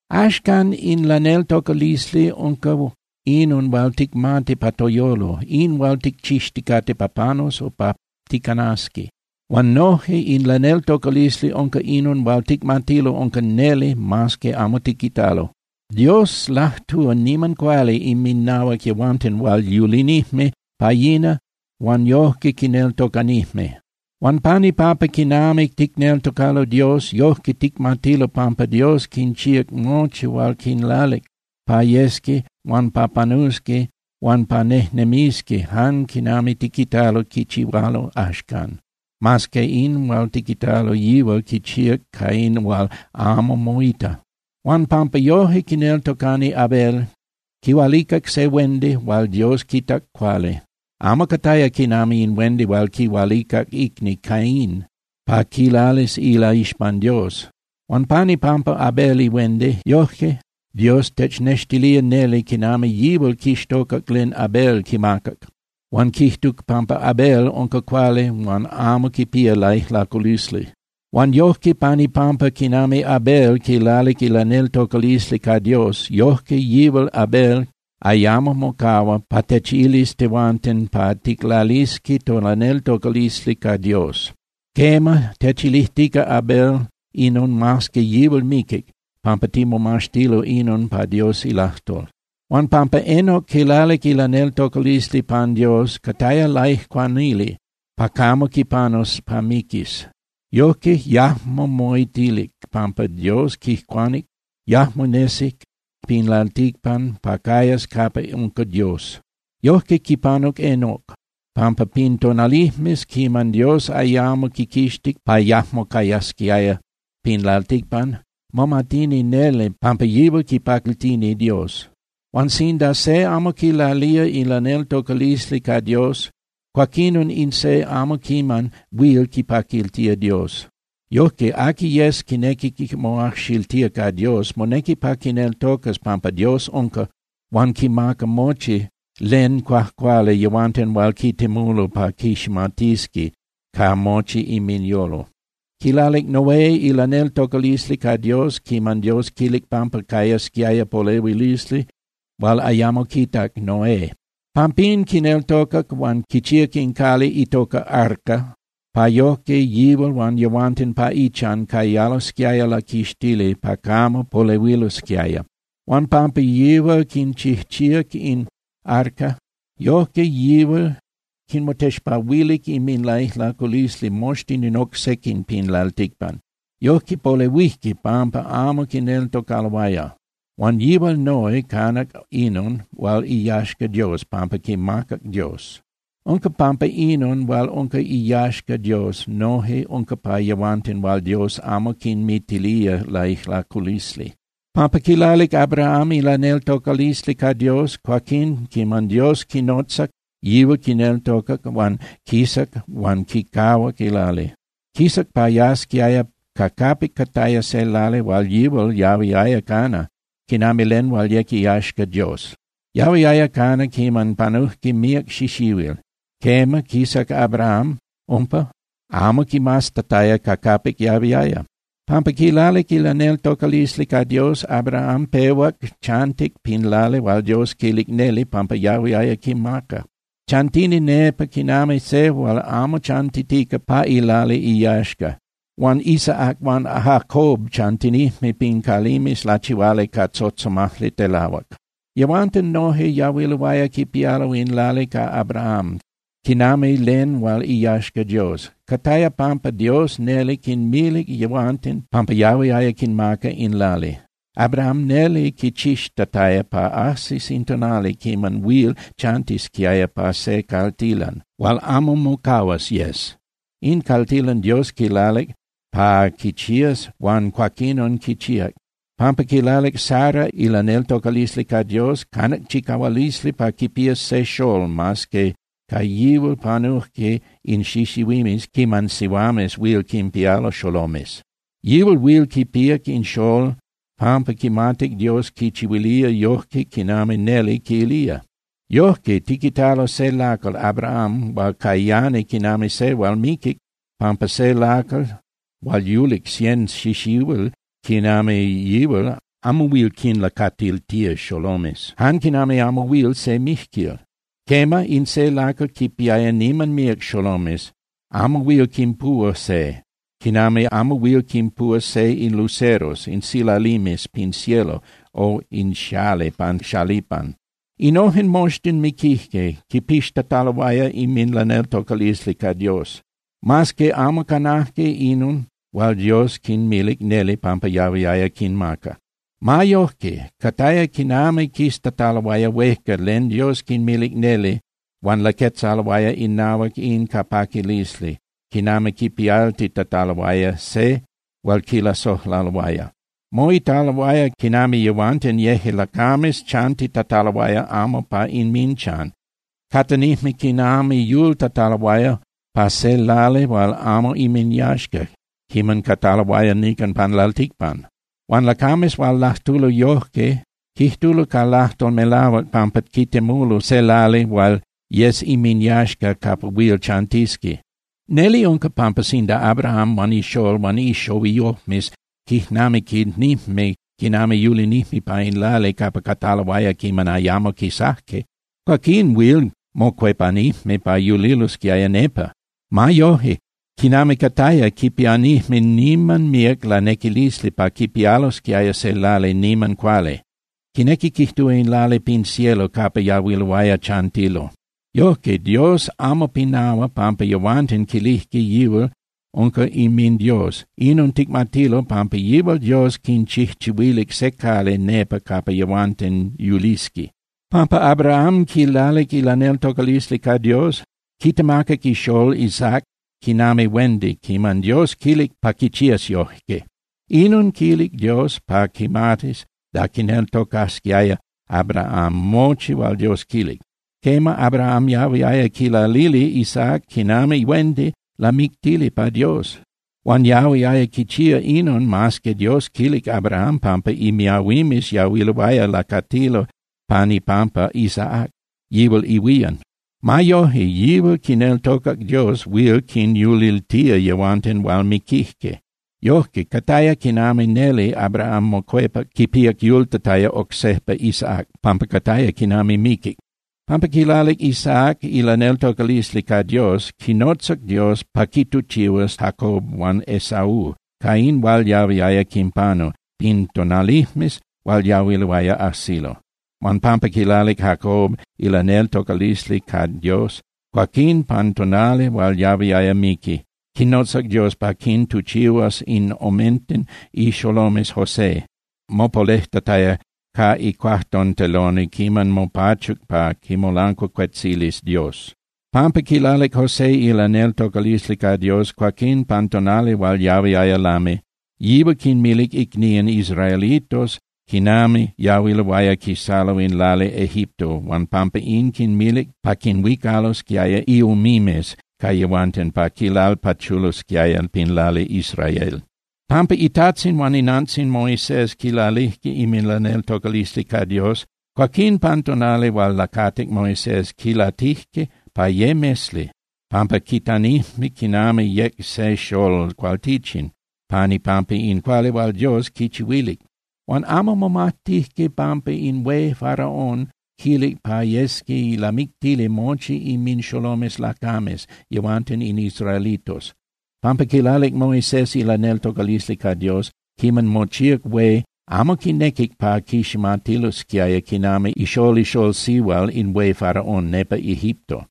Axcan, in laneltocalisli unca inon hual ticmati pa toyolo, in hual ticchixticate pa panus o pa ticanasqui. Huan noje in laneltocalisli unca inon hual ticmatilo unca neli mas que amo tiquitalo. Dios lajtúa niman cuali inminahuac yehuanten hual yulinijme pa yina huan yojque quineltocanijme. Huan pan ipampa quinami ticneltocalo Dios, yojque ticmatilo pampa Dios quinchíac mochi huan quinlalic pa yesqui huan pa panusqui huan pa nejnemisqui jan quinami tiquitalo quichihualo axcan, mas que in hual tiquitalo yihual quichíac ca in hual amo moita. Huan pampa yoje quineltocani Abel, quihualicac se huendi hual Dios quitac cuali, amo cataya quinami in huendi hual quihualicac icni Caín pa quilalis ilaixpan Dios. Huan pan ipampa Abel ihuendi, yojque Dios technextilía neli quinami yihual quixtocac len Abel quimacac huan quijtuc pampa Abel unca cuali huan amo quipía laijlaculisli. Huan yojque, pan ipampa quinami Abel quilalic ilaneltocalisli ca Dios, yojque yihual Abel ayamo mocahua pa techilis tehuanten pa ticlalisqui tolaneltocalisli ca Dios. Quema, techilijtica Abel inon mas que yihual miquic, pampa timomaxtilo inon pa Dios ilajtol. Huan pampa Enoc quilalic ilaneltocalisli pan Dios, cataya laijcuanili pa camo quipanus pa miquis. Yojque yajmo moitilic pampa Dios quijcuanic, yajmo nesic pin lalticpan pa cayas capa unca Dios. Yojque quipanuc Enoc, pampa pin tonalijmes quiman Dios ayamo quiquixtic pa yajmo cayasquiaya pin lalticpan, momatini neli pampa yihual quipaquiltini Dios. Huan sinda se amo quilalía ilaneltocalisli ca Dios, cuaquinon in se amo quiman huil quipaquiltía Dios. Yojque, aqui yes quinequi moajxiltía ca Dios, monequi pa quineltocas pampa Dios unca, huan quimaca mochi len cuajcuali yehuanten hual quitemulo pa quiximatisqui ca mochi inminyolo. Quilalic Noé ilaneltocalisli ca Dios quiman Dios quilic pampa cayasquiaya polehuilisli hual ayamo quitac Noé. Pampín quineltocac huan quichíac in cali itoca arca pa yojque yihual huan yehuanten pa ichan cayalosquiaya laquixtili pa camo polehuilosquiaya. Huan pampa yihual quichijchíac in arca, yojque yihual quinmotexpahuilic inminlaijlaculisli moxtin in oc sequin pin lalticpan. Yojque polehuijque pampa amo quineltocaloaya. Huan yihual Noé canac inon hual iyaxca Dios pampa quimacac Dios. Unca pampa inon hual unca iyaxca Dios noje unca pa yehuanten hual Dios amo quinmitilía laijlaculisli. Pampa quilalic Abraham ilaneltocalisli ca Dios, cuaquín quiman Dios quinotzac, yihual quineltocac huan quisac huan quicahuac ilali. Quisac pa yasquiaya ca capic cataya se lali hual yihual yahuiaya cana quinami len hual yec iyaxca Dios. Yahuiaya cana quiman panujque míac xixihuil. Quema, quisac Abraham umpa, amo quimaztataya ca capic yahuiaya. Pampa quilalic ilaneltocalisli ca Dios, Abraham pehuac chantic pin lali hual Dios quilic neli pampa yahuiaya quimaca. Chantini nepa quinami se hual amo chantitica pa ilali iyaxca. Huan Isaac huan Jacob chantinijme pin calimes lachihuali ca tzotzomajli telahuac. Yehuanten noje yahuiloaya quipialo in lali ca Abraham quinami len hual iyaxca Dios. Cataya pampa Dios neli quinmilic yehuanten pampa yahuiaya quinmaca in lali. Abraham neli quichixtataya pa ajsis in tonali quiman huil chantisquiaya pa se caltilan hual amo mocahuas yes. In caltilan Dios quilalic pa quichías huan cuaquinon quichíac. Pampa quilalic Sara ilaneltocalisli ca Dios, canac chicahualisli pa quipías se xolol, mas que ca yihual panujque in xixihuimes quiman sihuames huil quinpialo xolomes. Yihual huil quipíac in xolol pampa quimatic Dios quichihuilía yojque quinami neli quilía. Yojque, tiquitalo se lacal Abraham hual cayani quinami se hual miquic, pampa se lacal hual yulic cien xixihuil quinami yihual amo huil quinlacatiltía xolomes, jan quinami amo huil se mijquil. Quema, in se lacal quinpiaya niman míac xolomes, amo huil quinpuhua se, quinami amo huil quinpuhua se in luceros (silalimes) pin cielo o in xali pan xalipan. Innojen moxtin miquijque quipixtataloaya inminlaneltocalisli ca Dios, mas que amo canajque inon hual Dios quinmilic neli pampa yahuiaya quinmaca. Ma yojque cataya quinami quiztataloaya huejca len Dios quinmilic neli huan laquetzaloaya inahuac in ca paquilisli quinami quipialtitataloaya se hual quilasojlaloaya. Moitaloaya quinami yehuanten yeje lacames chantitataloaya amo pa inminchan. Catanijme quinami yultataloaya pa se lali hual amo inminyaxca quiman cataloaya nican pan lalticpan. Huan lacames hual lajtulo yojque quijtulo ca lajtol melahuac pampa quitemulo se lali hual yes inminyaxca capa huil chantisqui. Neli unca pampa sinda Abraham huan ixolol huan ixohuiyojmes quijnamiquinijme quinami yulinijme pa in lali capa cataloaya quiman ayamo quisajque, cuaquín huil mocuepanijme pa yulilosquiaya nepa. Ma yojque, quinami cataya, quipianijme niman míac lanequilisli pa quipialosquiaya se lali niman cuali. Quinequi quijtúa in lali pin cielo capa yahuiloaya chantilo. Yojque, Dios amo pinahua pampa yehuanten quilijque yihual unca inminDios. Inon ticmatilo, pampa yihual Dios quinchijchihuilic se cali nepa capa yehuatenn yulisqui. Pampa Abraham quilalic ilaneltocalisli ca Dios, quitemacac ixolol Isaac quinami huendi quiman Dios quilic pa quichías yojque. Inon quilic Dios pa quimatis da quineltocasquiaya Abraham mochi hual Dios quilic. Quema, Abraham yahuiaya quilalili Isaac quinami huendi lamictili pa Dios. Huan yahuiaya quichía inon mas que Dios quilic Abraham pampa imiahuimes yahuiloaya lacatilo pan ipampa Isaac, yihual ihuían. Ma yoje, yihual quineltocac Dios huil quinyuliltía yehuanten hual miquijque. Yojque, cataya quinami neli Abraham mocuepac quipíac yultataya oc sejpa Isaac, pampa cataya quinami miquic. Pampa quilalic Isaac ilaneltocalisli ca Dios, quinotzac Dios pa quituchihuas Jacob huan Esaú ca in hual yahuiaya quinpanu pin tonalijmes hual yahuiloaya ajsilo. Huan pampa quilalic Jacob ilaneltocalisli ca Dios, cuaquín pan tonali hual yahuiaya miqui, quinotzac Dios pa quintuchihuas in omenten ixolomes José, mopalejtataya ca icuajtonteloni quiman mopachuc pa quimolancuacuetzilis Dios. Pampa quilalic José ilaneltocalisli ca Dios, cuaquín pan tonali hual yahuiaya lami, yihual quinmilic icnían israelitos quinami yahuiloaya quisalo in lali Egipto, huan pampa in quinmilic pa quinhuicalosquiaya iumimes ca yehuanten pa quinlalpachulosquiaya pin lali Israel. Pampa itajtzin huan inantzin Moisés quilalijque inminlaneltocalisli ca Dios, cuaquín pan tonali hual lacatic Moisés, quilatijque pa ye mesli, pampa quitanijme quinami yec se xolol cualtichin pan ipampa in cuali hual Dios quichihuilic. Huan amo momajtijque pampa in hué Faraón quilic pa yesqui lamictili mochi inminxolomes lacames yehuanten in israelitos. Pampa quilalic Moisés ilaneltocalisli ca Dios, quiman mochíac hué, amo quinequic pa quiximatilosquiaya quinami ixolol ixolol sihual in hué Faraón nepa Egipto.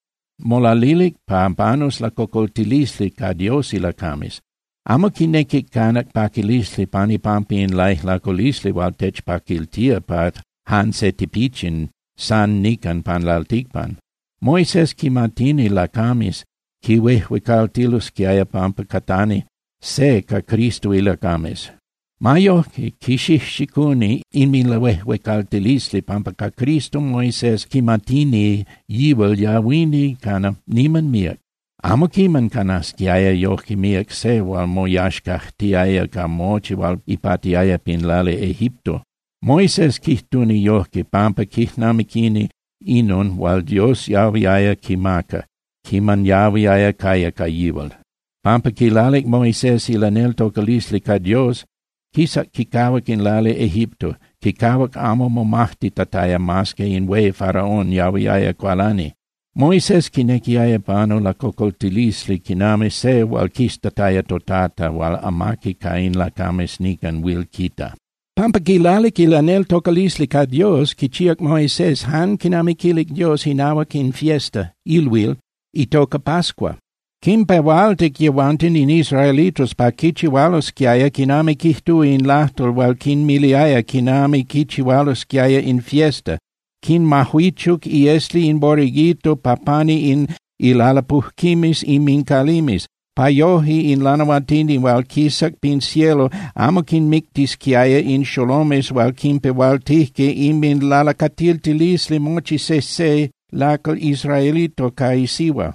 Molalilic pa panus lacocoltilisli ca Dios ilacames. Amo quinequic canac paquilisli pan ipampa in laijlaculisli hual techpaquiltía pa jan se tipichin san nican pan lalticpan. Moisés quimatini lacames quihuejuecaltilosquiaya pampa catani se ca Cristo ilacames. Ma yojque quixijxicuni inminlahuejuecaltilisli, pampa ca Cristo Moisés quimatini yihual yahuini cana niman míac. Amo quiman canasquiaya yoje míac se hual moyaxcajtiaya ca mochi hual ipatiaya pin lali Egipto. Moisés quijtuni yojque, pampa quijnamiquini inon hual Dios yahuiaya quimaca quiman yahuiaya caya ca yihual. Pampa quilalic Moisés ilaneltocalisli ca Dios, quisac quicahuac in lali Egipto. Quicahuac amo momajtitataya mas que in hué Faraón yahuiaya cualani. Moisés quinequiaya panu lacocoltilisli quinami se hual quiztataya toTata hual amaqui ca in lacames nican huil quita. Pampa quilalic ilaneltocalisli ca Dios, quichíac Moisés jan quinami quilic Dios inahuac in fiesta (ilhuil) itoca pascua. Quinpehualtic yehuanten in israelitos pa quichihualosquiaya quinami quijtúa in lajtol hual quinmiliaya quinami quichihualosquiaya in fiesta, quinmajuichuc iesli in borreguito pa pani in ilalapujquimes inmincalimes, pa yoje in lanahuatini hual quisac pin cielo amo quinmictisquiaya in xolomes hual quipehualtijque inminlalacatiltilisli mochi sejse lacal israelito ca isihua.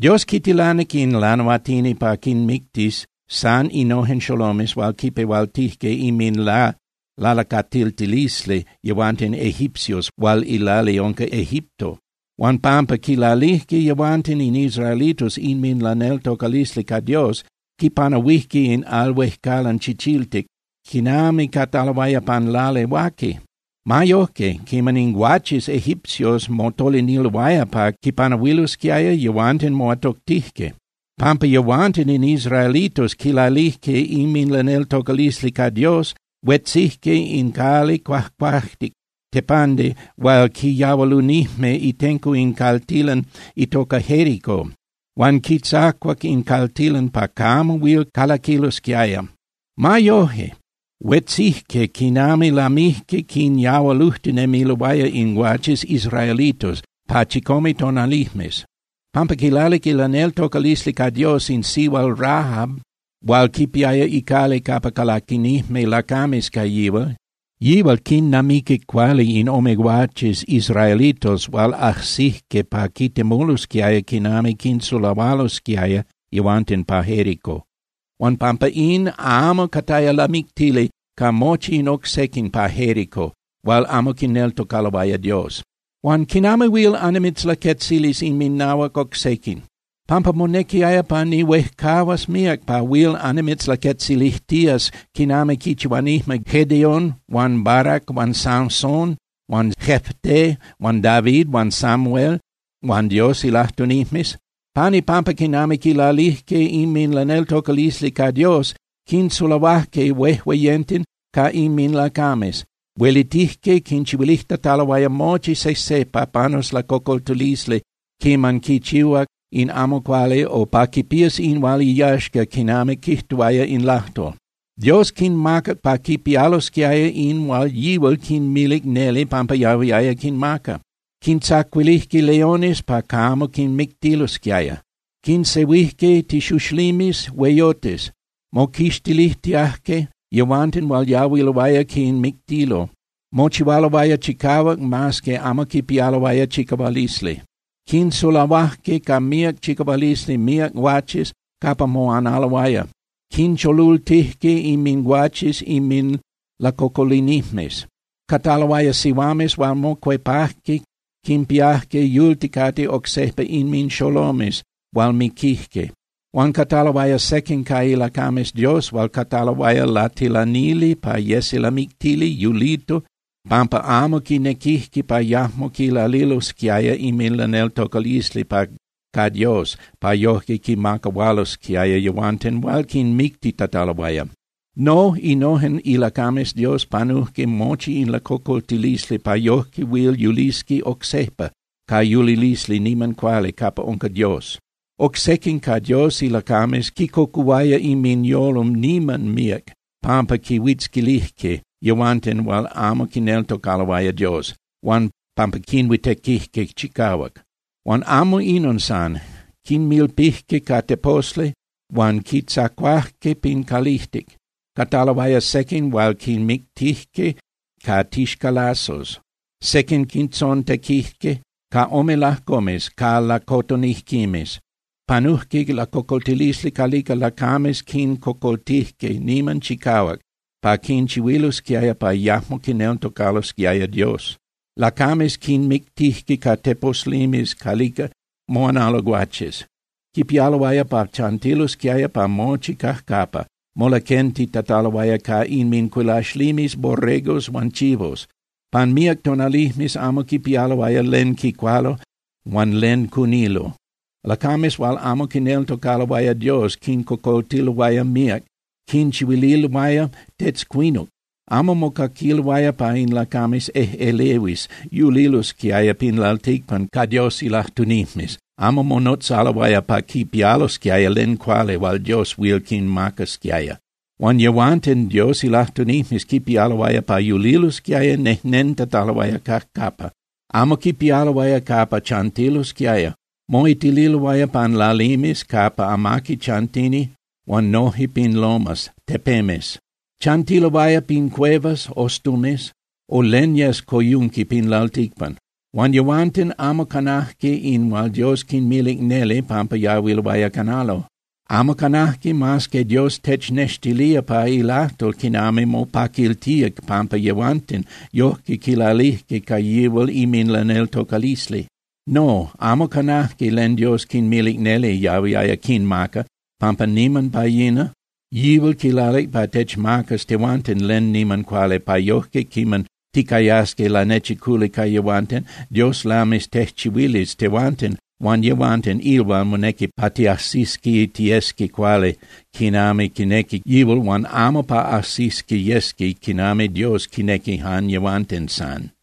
Dios quitilanic in lanahuatini pa quinmictis san innojen xolomes hual quipehualtijque inminlalacatiltilisli yehuanten egipcios hual ilali unca Egipto. Huan pampa quilalijque yehuanten in israelitos inminlaneltocalisli ca Dios, quipanahuijque in Al Huejcalan Chichiltic quinami cataloaya pan lali huaqui. Ma yojque, quiman in guaches egipcios motoliniloaya pa quipanahuilosquiaya, yehuanten moatoctijque. Pampa yehuanten in israelitos quilalijque inminlaneltocalisli ca Dios, huetzijque in cali cuajcuajtic (tepandi) hual quiyahualunijme itenco in caltilan itoca Jérico huan quitzacuac in caltilan pa camo huil calaquilosquiaya. Ma yoje, huetzijque quiman lamijque quinyahualujtinemiloaya in guaches israelitos pa chicome tonalijmes. Pampa quilalic ilaneltocalisli ca Dios in sihual Rahab hual quipiaya icali capa calaquinijme lacames ca yihual, yihual quinnamiquic cuali in ome guaches israelitos hual ajsijque pa quitemulosquiaya quinami quinsulahualosquiaya yehuanten pa Jérico. Huan pampa in, amo cataya lamictili ca mochi in oc sequin pa Jérico hual amo quineltocaloaya Dios. Huan ¿quinami huil annimitzlaquetzilis inminahuac oc sequin? Pampa monequiaya pa nihuejcahuas míac pa huil annimitzlaquetzilijtías quinami quichihuanijme Gedeón huan Barac huan Sansón huan Jefté huan David huan Samuel huan Dios ilajtunijmes. Pan ipampa quinami quilalijque inminlaneltocalisli ca Dios, quinsulahuajque huejueyenten ca inminlacames. Huelitijque quinchihuilijtataloaya mochi sejse pa panus lacocoltilisli quiman quichihuac in amo cuali o pa quipías in hual iyaxca quinami quijtuaya in lajtol. Dios quinmacac pa quipialosquiaya in hual yihual quinmilic neli pampa yahuiaya quinmaca. Quintzacuilijque leones pa camo quinmictilosquiaya. Quinsehuijque tixuxlimes hueyotes. Moquixtilijtiajque yehuanten hual yahuiloaya quinmictilo. Mochihualoaya chicahuac mas que amo quipialoaya chicahualisli. Quinsulahuajque ca míac chicahualisli míac guaches capa moanaloaya. Quincholultijque inminguaches inminlacocolinijmes. Cataloaya sihuames hual mocuepajque quinpiajque yulticate oc sejpa inminxolomes hual miquijque. Huan cataloaya sequin ca ilacames Dios hual cataloaya latilanili pa yesi lamictili yulito pampa amo quinequijque pa yajmo quilalilosquiaya inminlaneltocalisli ca Dios pa yoje quinmacahualosquiaya yehuanten hual quinmictitataloaya. No, innojen ilacames Dios panujque mochi in lacocoltilisli pa yoje huil yulisqui oc sejpa ca yulilisli niman cuali capa unca Dios. Oc sequin ca Dios ilacames quicocuhuaya inminyolo niman míac pampa quinhuitzquilijque yehuanten hual amo quineltocaloaya Dios, huan pampa quinhuitequijque chicahuac. Huan amo inon san. Quinmilpijque ca teposli huan quintzacuajque pin calijtic. Cataloaya sequin hual quinmictijque ca tixcalazos. Sequin quintzontequijque ca ome lajcomes ca lacotonijquimes. Panujque lacocoltilisli calica lacames quincocoltijque niman chicahuac pa quinchihuililosquiaya pa yajmo quineltocalosquiaya Dios. Lacames quinmictijque ca teposlimes calica moanalo guaches. Quipialoaya pa chantilosquiaya pa mochi cajcapa, molaquentitataloaya ca inmincuilaxlimes borregos huan chivos. Pan míac tonalijmes amo quipialoaya len quicualo huan len cunilo. Lacames hual amo quineltocaloaya Dios quincocoltiloaya, míac quinchihuililoaya tetzcuinuc. Amo mocaquiloaya pa in lacames ejꞌelehuis yulilosquiaya pin lalticpan ca Dios ilajtunijmes, amo monotzaloaya pa quipialosquiaya len cuali hual Dios huil quinmacasquiaya. Huan yehuanten Dios ilajtunijmes quipialoaya pa yulilosquiaya nejnentataloaya cajcapa. Amo quipialoaya capa chantilosquiaya. Moitililoaya pan lalimes capa amaqui chantini huan noje pin lomas (tepemes). Chantiloaya pin cuevas (ostumes) o len yes coyunqui pin lalticpan. Huan yehuanten amo canajque in hual Dios quinmilic neli pampa yahuiloaya canalo. Amo canajque mas que Dios technextilía pa ilajtol quinami mopaquiltía pampa yehuanten yojque quilalijque ca yihual inminlaneltocalisli. No, amo canajque len Dios quinmilic neli yahuiaya quinmaca, pampa niman pa yina, yihual quilalic pa techmacas tehuanten len niman cuali pa yojque quiman ticayasqui lanechiculi ca yehuanten, Dios lamis tejchihuilis tehuanten huan yehuanten in hual monequi pa tiajsisqui tiyesqui cuali quinami quinequi yihual huan amo pa ajsisqui yesqui quinami Dios quinequi jan yehuanten san.